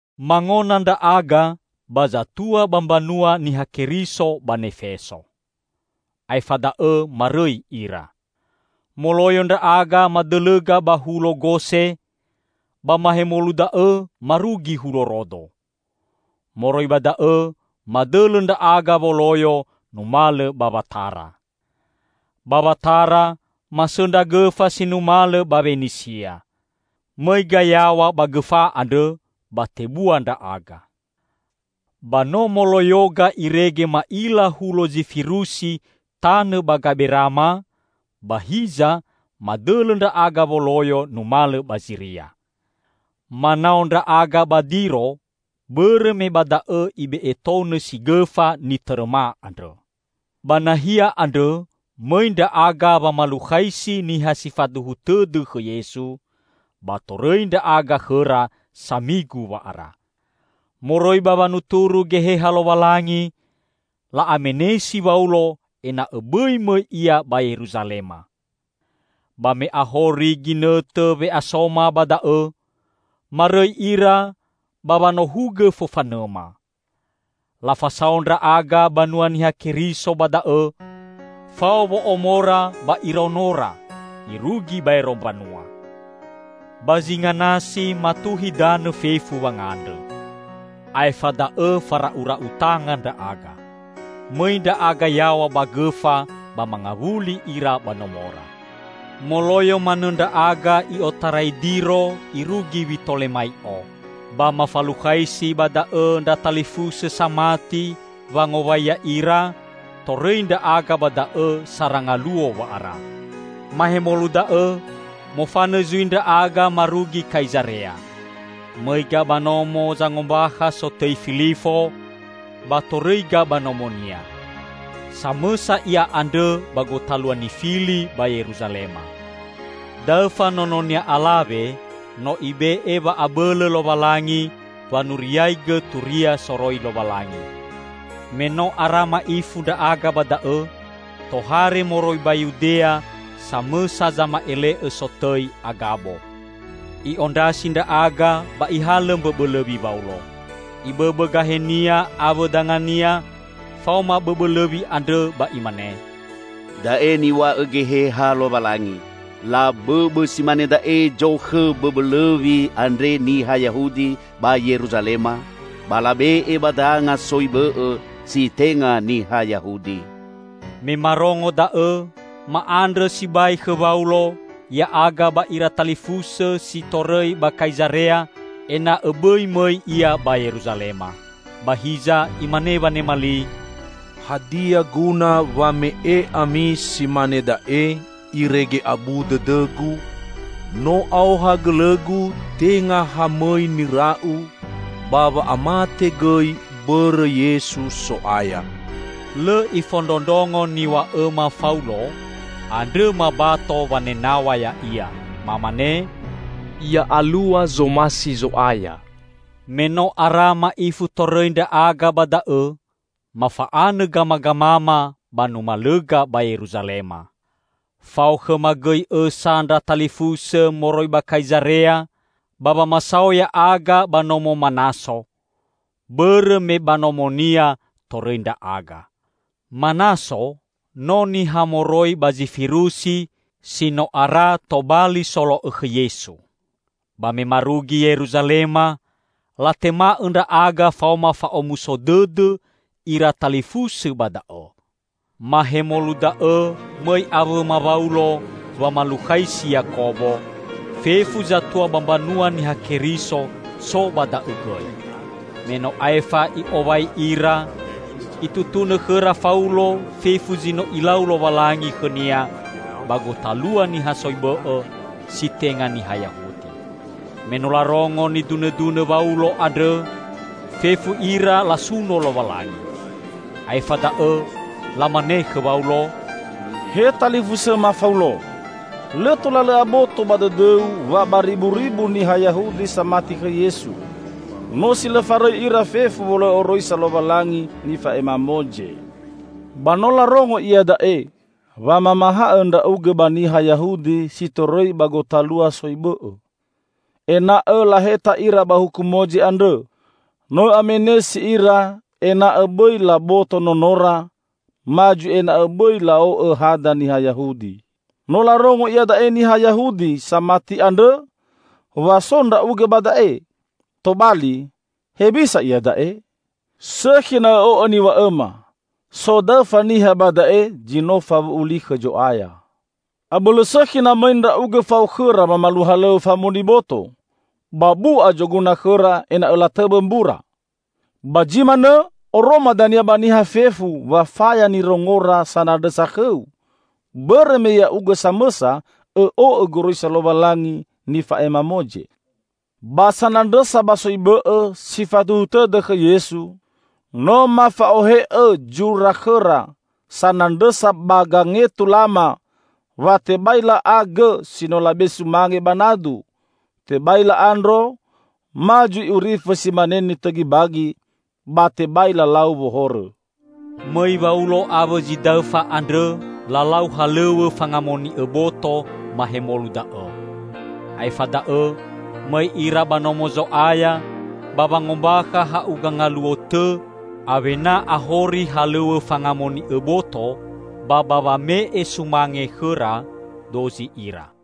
Mangona ndra'aga ba zatua ba mbanua Niha Keriso ba Nefeso. Aefa da'õ marõi ira. Moloyo ndra'aga madõlõga ba hulo Gose; ba mahemolu da'õ marugi hulo Rodo. Moroi ba da'õ madõlõ ndra'aga woloyo numalõ ba Watara. Ba Watara masõndra gõfa si numalõ ba Wenisia. Mõiga yaw̃a ba gõfa andrõ ba tebua ndra'aga. Ba no moloyoga irege ma'ila hulo Zifirusi tanõ ba gamberama; ba hiza madõlõ ndra'aga woloyo numalõ ba Ziria. Manao ndra'aga ba Diro, bõrõ me ba da'õ ibe'e tou nõsi gõfa nitõrõma andrõ. Ba nahia andrõ mõi ndra'aga wamalukhaisi niha si faduhu tõdõ khõ Yesu, ba torõi ndra'aga khõra samigu wa'ara. Moroi ba wanuturu Geheha Lowalangi, la'amenesi Waulo ena'õ bõi mõi ia ba Yeruzalema. Ba me ahori ginõtõ we'asoma ba da'õ, marõi ira ba wanohugõ fofanõma. Lafasao ndra'aga banua Niha Keriso ba da'õ, fao wo'omora ba iraonora, irugi baero mbanua. Ba zinga nasi matuhi danõ fefu wangandrõ. Aefa da'õ fara'ura'u tanga ndra'aga. Mõi ndra'aga yaw̃a ba gõfa, ba mangawuli ira ba nomora. Moloyo manõ ndra'aga i'otarai Diro irugi Witolemai'o. Ba mafalukhaisi ba da'õ ndra talifusõ samati wangowai ya'ira, torõi ndra'aga ba da'õ sara ngaluo wa'ara. Mahemolu da'õ, mofanõ zui ndra'aga marugi Kaizarea. Mõiga ba nomo zangombakha sotõi Filifo, ba torõiga ba nomonia. Samõsa ia andrõ ba gotalua nifili ba Yeruzalema. Daõfa nononia alawe no Ibe'e wa'abõlõ Lowalangi wanuriaigõ turia soroi Lowalangi. Me no ara ma'ifu ndra'aga ba da'õ, tohare moroi ba Yudea samõsa zama'ele'õ sotõi Agabo. I'ondrasi ndra'aga ba ihalõ mbõbõ lõwi Waulo. Ibõbõ gahenia awõ dangania faoma bõbõ lõwi andrõ ba imane, "Da'e niw̃a'õ Geheha Lowalangi: Labõbõ si mane da'e zokhõ bõbõ lõwi andre niha Yahudi ba Yeruzalema, ba labe'e ba danga soi bõ'õ si tenga niha Yahudi." Me marongo da'õ, ma'andrõ sibai khõ Waulo, ya'aga ba ira talifusõ si torõi ba Kaizarea, ena'õ bõi mõi ia ba Yeruzalema. Ba hiza imane wanema li, "Hadia guna wa me'e ami si mane da'e irege abu dõdõgu? No aoha gõlõgu tenga ha mõi nira'u, ba wa'amate gõi bõrõ Yesu So'aya." Lõ ifondrondrongo niw̃a'õma Faulo, andrõ mabato wanenaw̃a ya'ia. Mamane, "Ya alua zomasi Zo'aya." Me no ara ma'ifu torõi ndra'aga ba da'õ, mafa'anõ gamagamama ba numalõga ba Yeruzalema. Fao khõma gõi õsa ndra talifusõ moroi ba Kaizarea ba wamasao ya'aga ba nomo Manaso, bõrõ me ba nomonia torõi ndra'aga. (Manaso no niha moroi ba Zifirusi si no ara tobali solo'õ khõ Yesu.) Ba me marugi Yeruzalema, latema'õ ndra'aga faoma fa'omuso dõdõ ira talifusõ ba da'õ. Mahemolu da'õ mõi awõma Waulo wamalukhaisi Yakobo; fefu zatua ba mbanua Niha Keriso so ba da'õ gõi. Me no aefa i'owai ira, itutunõ khõra Faulo fefu zi no Ilau Lowalangi khõnia ba gotalua niha soi bõ'õ si tenga niha Yahudi. Me no larongo nidunõdunõ Waulo andrõ, fefu ira lasuno Lowalangi. Aefa da'õ lamane khõ Waulo, "He talifusõma Faulo! Lõ tola lõ'õ aboto ba dõdõu wa bariburibu niha Yahudi samati khõ Yesu. No si lõ farõi ira fefu wolo'õ Oroisa Lowalangi nifa'ema Moze. Ba no larongo iada'e wa mamahaõ ndra'ugõ ba niha Yahudi si torõi ba gotalua soi bõ'õ, ena'õ laheta ira ba huku Moze andrõ. No õ'amenesi ira ena'õ bõi laboto nonora ma zui ena'õ bõi la'o'õ hada niha Yahudi. No larongo iada'e niha Yahudi samati andrõ wa so ndra'ugõ ba da'e. Tobali, hewisa iada'e? Sõkhi na õ'o'õ niw̃a'õma. So daõfa niha ba da'e zi no fawu'u li khõ Zo'aya. Abõlõ sõkhi na mõi ndra'ugõ fao khõra wamalua halõw̃õ famoni boto, ba bu'a zoguna khõra ena'õ latõwõ mbura. Ba zi manõ oroma dania ba niha fefu wa faya nirongora sanandrõsa khõu, bõrõ me ya'ugõ samõsa õ'o'õ goroisa Lowalangi nifa'ema Moze. Ba sanandrõsa ba soi bõ'õ si faduhu tõdõ khõ Yesu, no mafa'ohe'õ zura khõra sanandrõsa ba gangetulama wa tebai la'a gõ si no labe'e sumange ba nadu, tebai la'a ndro, ma zui urifõ si mane nitõgi bagi; ba tebai lalau wohorõ." Mõi Waulo awõ zi daõfa andrõ lalau halõw̃õ fangamoni'õ boto mahemolu da'õ. Aefa da'õ mõi ira ba Nomo Zo'aya ba wangombakha ha'uga ngaluo tõ awena ahori halõw̃õ fangamoni'õ boto ba ba wame'e sumange khõra dozi ira.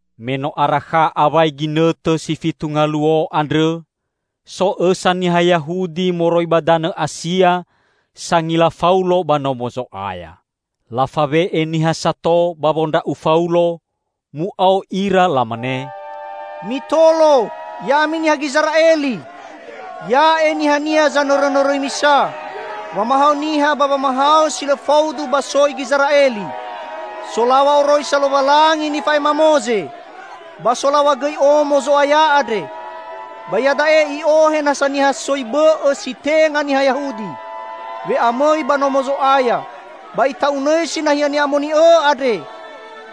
Me no arakha awai ginõtõ si fitu ngaluo andrõ, so õsa niha Yahudi moroi ba danõ Asia sangila Faulo ba Nomo Zo'aya. Lafawe'e niha sato ba wondra'u Faulo, mu'ao ira lamane, "Mitolo, ya'ami niha Gizera'eli! Ya'e nihania zanõrõnõrõi misa wamahaõ niha ba wamahaõ si lõ faudu ba soi Gizera'eli, solaw̃a oroisa Lowalangi nifa'ema Moze, ba solaw̃a gõi Omo Zo'aya andre. Ba iada'e i'ohe nasa niha soi bõ'õ si tenga niha Yahudi we'amõi ba Nomo Zo'aya ba ita'unõisi nahia ni'amoni'õ andre!"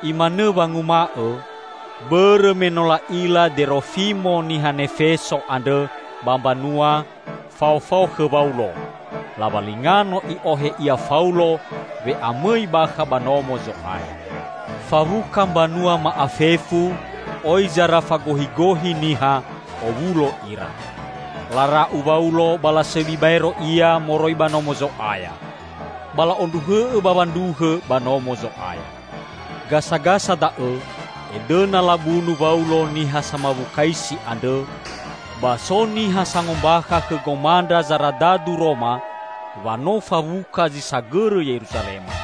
(Imanõ wanguma'õ bõrõ me no la'ila Derofimo niha Nefeso andrõ ba mbanua, faofao khõ Waulo; lawalinga no i'ohe ia Faulo we'amõi bakha ba Nomo Zo'aya.) Fawuka mbanua ma'afefu, oi zara fagohigohi niha, owulo ira. Lara'u Waulo ba lasõbi baero ia moroi ba Nomo Zo'aya. Ba la'ondruhõ'õ bawa ndruhõ ba Nomo Zo'aya. Gasagasa da'õ edõna labunu Waulo niha samawukaisi andrõ, ba so niha sangombakha khõ gomandra zaradadu Roma wa no fawuka zi sagõrõ Yeruzalema.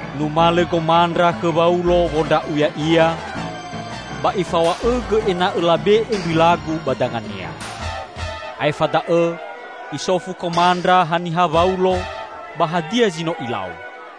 Numalõ gomandra khõ Waulo wondra'u ya'ia, ba ifaw̃a'õgõ ena'õ labe'e mbilagu ba dangania. Aefa da'õ isofu komandra haniha Waulo ba hadia zi no ilau.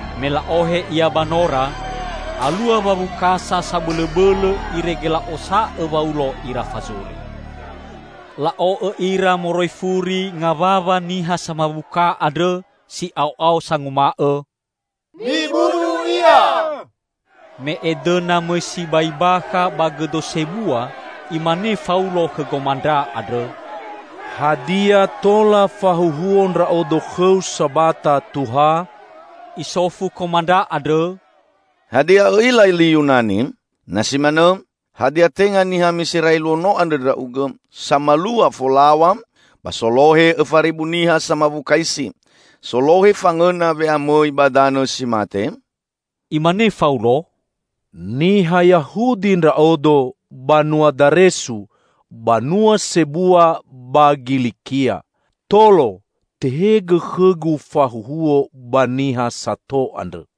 Me la'ohe ia ba nora, alua wawukasa sabõlõbõlõ irege la'osa'õ Waulo ira fazuri. La'o'õ ira moroi furi ngawawa niha samawuka andrõ si'ao'ao sanguma'õ, "Mibunu ia!" Me edõna mõi sibai bakha ba gõdo sebua, imane Faulo khõ gomandra andrõ, "Hadia tola fahuhuo ndra'odo khõu sabata, Tuha?" Isofu komandra andrõ, "Hadia õ'ila li Yunani?" "Na si manõ, hadia tenga niha Miserai luo no andrõ ndra'ugõ, samalua folaw̃a ba solohe õfa ribu niha samawukaisi, solohe fangõna we'amõi ba danõ si mate?" Imane Faulo, "Niha Yahudi ndra'odo; banua Daresu, banua sebua ba Gilikia. Tolo, tehegõ khõgu fahuhuo ba niha sato andrõ."